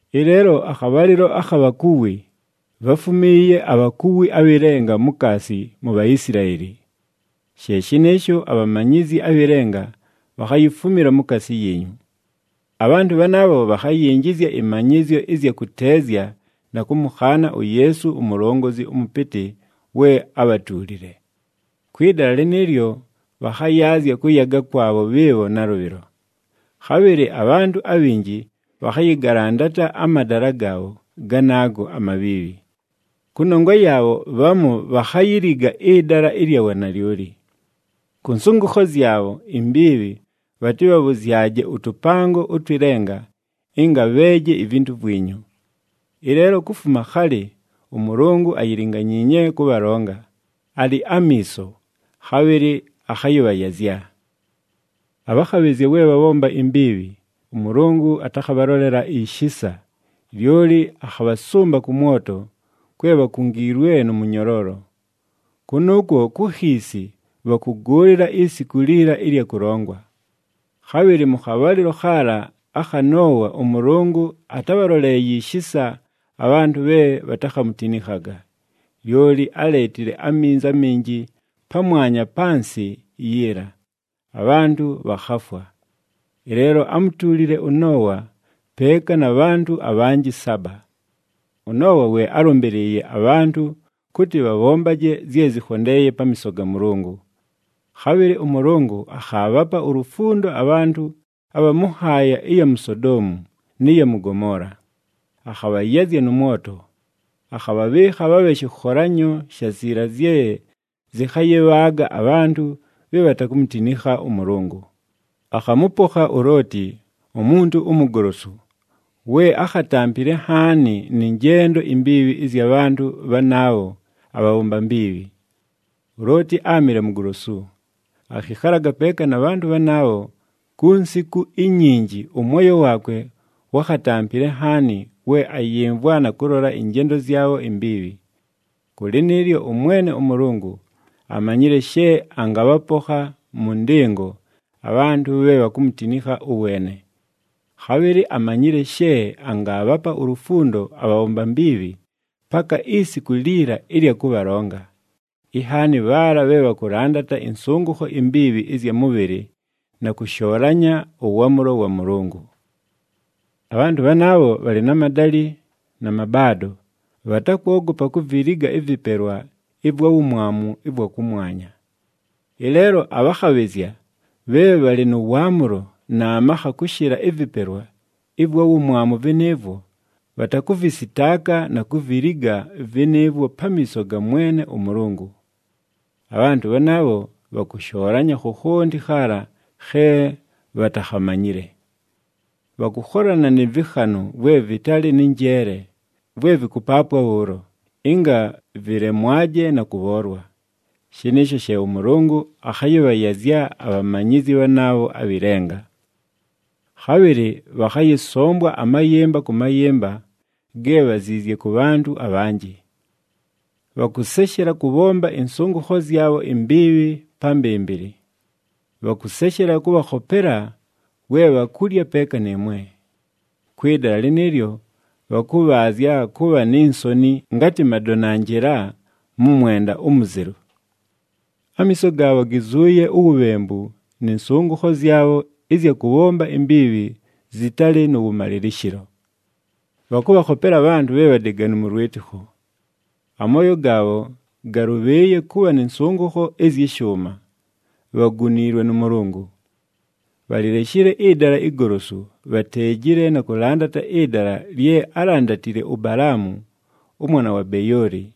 Ɨleelo akhabhalɨlo akha bhakuwi, bháfumiiye abhakuwi abhɨ lenga mukaasi mu Bhaisilaeli. She shɨnɨɨsho abhamanyizyi abhɨ lenga bhakhayifumila mukaasi yiinyu. Abhantʉ bhanaabho bhakhayinjizya ɨmanyɨzyo ɨzya kʉteezya na kʉmʉkhaana uYeesu uMulongozi ʉMʉpɨtɨ we ábhatuulile. Kwɨ dala lɨnɨɨlyo bhakhayaazya kʉyaga kwabho bhɨɨbho nalʉbhɨlo. Khabhɨlɨ abhantʉ abhinji bhakhayɨgalandata amadala gaabho ganaago amabhiibhi. Kʉnongwa yaabho, bhamu bhakhayiliga ɨdala ɨlya wanalyoli. Kʉ nsʉngʉkho zyabho imbiibhi bhatɨbhabhʉzyaje ʉtʉpango ʉtwɨ lenga ɨnga bheeje ivintu vwinyu. Ɨleelo kufuma khalɨ ʉMʉlʉngʉ ayilinganyiinye kʉbhalonga, alɨ amiiso, khabhɨlɨ akhayɨbhayazya! Abhakhabhɨzya we bhabhomba imbiibhi, ʉMʉlʉngʉ atakhabhalolela ishisa, lyoli akhabhasʉmba kʉ mwoto, kwe bhakungiilwe nʉ mʉnyoloolo. Kʉnʉʉkwo ku khiisi bhakʉgʉʉlɨla isiku liila ɨlya kʉlongwa. Khabhɨlɨ mʉ khabhalɨlo khaala akha Noowa ʉMʉlʉngʉ atábhaloleeye ishisa abhantʉ bhe bhatakhamutinikhaga, lyoli áleetile aminzi aminji pamwanya pa nsɨ yiila, abhantʉ bhakhafwa. Ɨleelo ámutuulile ʉNoowa peeka na bhantʉ abhanjɨ saba. ɄNoowa we álʉmbɨlɨɨye abhantʉ kʉtɨ bhabhombaje zye zɨkhondeeye pamiiso ga Mʉlʉngʉ. Khabhɨlɨ ʉMʉlʉngʉ akhaabhapa ulufundo abhantʉ abha mʉ nhaaya ɨya mu Sodoomu nɨ ya mʉ Gomoola, akhabhayazya nʉ mwoto, akhabhabhɨɨkha bhabhe shɨkholanyo sha ziila zye zɨkhayɨbhaaga abhantʉ bhe bhatakumutinikha ʉMʉlʉngʉ. Akhamʉpokha uLooti, umuntu umugolosu, we ákhatampile nhaani nɨ njendo imbiibhi ɨzya bhantʉ bhanaabho abhabhomba mbiibhi. ULooti áamɨle mugolosu, akhɨkhalaga peeka na bhantʉ bhanaabho ku nsiku inyinji ʉmwoyo waakwe wákhatampile nhaani we ayɨmvwa na kʉlola ɨnjendo zyabho imbiibhi. Kʉ lɨnɨɨlyo, ʉMwene ʉMʉlʉngʉ amanyile she angabhapokha mʉ ndɨngo abhantʉ bhe bhakumutinikha ʉweene. Khabhɨlɨ amanyile she angaabhapa ulufundo abhabhomba mbiibhi paka isiku liila ɨlya kʉbhalonga, inhaani bhaala bhe bhakʉlandata ɨnsʉngʉkho imbiibhi ɨzya mʉbhɨlɨ na kʉshoolanya ʉwaamʉlo wa Mʉlʉngʉ. Abhantʉ bhanaabho bhalɨ na madalɨ na mabaado, bhatakwogopa kuviliga ɨvɨpelwa ɨvwa wumwamu ɨvwa kʉmwanya. Ɨleelo abhakhabhɨzya bhe bhalɨ nʉ waamʉlo na makha kʉshɨla ɨvɨpelwa ɨvwa wumwamu vɨnɨɨvwo, bhatakʉvɨsɨtaaka na kuviliga vɨnɨɨvwo pamiiso ga Mwene ʉMʉlʉngʉ. Abhantʉ bhanaabho bhakʉshoolanya khokhonti khaala khe bhatakhamanyile. Bhakʉkholana nɨ vɨkhanʉ vwe vɨtalɨ nɨ njeele, vwe vɨkʉpaapwa bhʉʉlo, ɨnga vɨlemwaje na kʉbhoolwa! Shɨnɨɨsho she ʉMʉlʉngʉ akhayɨbhayazya abhamanyizi bhanaabho abhɨ lenga. Khabhɨlɨ bhakhayɨsombwa amayɨmba kʉ mayɨmba ge bhaziizye kʉ bhantʉ abhanjɨ. Bhakʉseshela kʉbhomba ɨnsʉngʉkho zyabho imbiibhi pa mbɨmbɨlɨ. Bhakʉseshela kʉbhakhopela we bhakulya peeka nɨɨmwe. Kwɨ dala lɨnɨɨlyo bhakʉbhaazya kʉbha ni nsoni ngatɨ madonanjɨla mʉ mwenda umuzelu. Amiiso gaabho gizuuye uwubhembu nɨ nsʉngʉkho zyabho ɨzya kʉbhomba imbiibhi zɨtalɨ nʉ wʉmalɨlɨshɨlo. Bhakʉbhakhopela abhantʉ bhe bhadeganu mʉ lwɨtɨkho. Amooyo gaabho galʉbhɨɨye kʉbha nɨ nsʉngʉkho ɨzyɨ shʉʉma. Bhaguniilwe nʉ Mʉlʉngʉ! Bhalileshile ɨdala igolosu, bhateejile na kʉlandata ɨdala lye álandatile uBalaamu, ʉmwana wa Beyooli.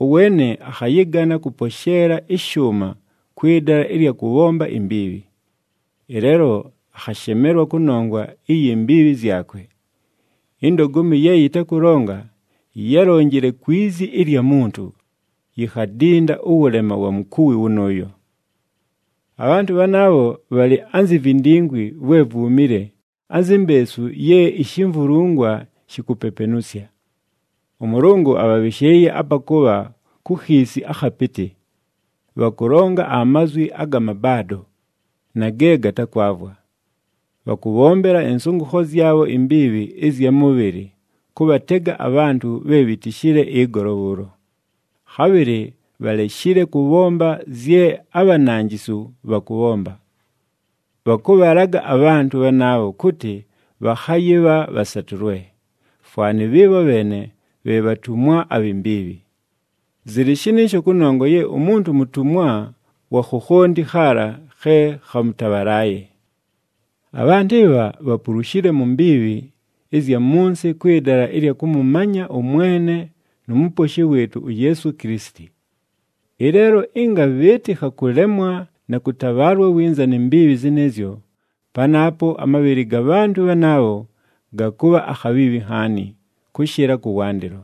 Ʉweene akhayɨgana kʉposheela ɨshʉʉma kwɨ dala ɨlya kʉbhomba imbiibhi. Ɨleelo akhashemelwa kʉnongwa iyi mbiibhi zyakwe. Indogomi ye yɨtakʉlonga, yálonjile kwi zi ɨlya muntu, yikhadinda ʉwʉlema wa mukuwi wʉnʉʉyo. Abhantʉ bhanaabho bhalɨ anzi vindingwi vwe vwumile, anzi mbeesu ye ishimvulungwa shikupepenusya. ɄMʉlʉngʉ abhabhɨshɨɨye apa kʉbha ku khiisi akhapɨtɨ. Bhakʉlonga amazwi aga mabaado na ge gatakwavwa. Bhakʉbhombela ɨnsʉngʉkho zyabho imbiibhi ɨzya mʉbhɨlɨ kʉbhatega abhantʉ bhe bhitishile ɨgolo bhʉʉlo, khabhɨlɨ bhaleshile kʉbhomba zye abhananjisu bhakʉbhomba. Bhakʉbhalaga abhantʉ bhanaabho kʉtɨ bhakhayɨbha bhasatʉlwe, fwanɨ bhɨɨbho bheene bhe bhatumwa abhi mbiibhi. Zɨlɨ shɨnɨɨsho kʉnongwa ye umuntu mutumwa wa khokhonti khaala khe khamʉtabhalaaye. Abhantʉ ɨbha bhapulushile mu mbiibhi ɨzya mʉ nsɨ kwɨ dala ɨlya kʉmʉmanya ʉMwene nu Muposhi wɨɨtʉ uYeesu Kilisiti. Ɨleelo ɨnga bhɨɨtɨkha kʉlemwa na kʉtabhaalwa winza ni mbiibhi zɨnɨɨzyo, panaapo amabhɨlɨ ga bhantʉ bhanaabho gakʉbha akhabhiibhi nhaani, kʉshɨla kʉwandɨlo.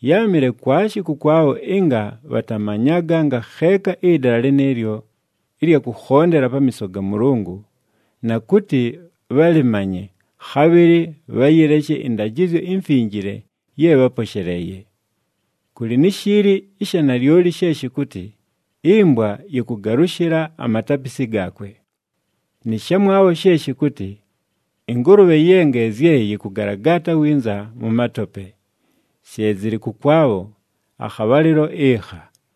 Yáamɨle kwashi kʉkwabho ɨnga bhatamanyaga ngakheeka ɨdala lɨnɨɨlyo ɨlya kʉkhondela pamiiso ga Mʉlʉngʉ, na kʉtɨ bhalɨmanye, khabhɨlɨ bhayɨleshe ɨndajɨzyo imfinjile ye bháposheleeye. Kʉlɨ ni shiili ɨsha nalyoli she shɨkʉtɨ, “Ɨmbwa yɨkʉgalʉshɨla amatapisi gaakwe,” nɨ shamwabho she shɨkʉtɨ, “Ɨngʉlʉbhe ye ngeezye yɨkʉgalagaata winza mʉ matope!” She zɨlɨ kʉkwabho akhabhalɨlo ɨkha.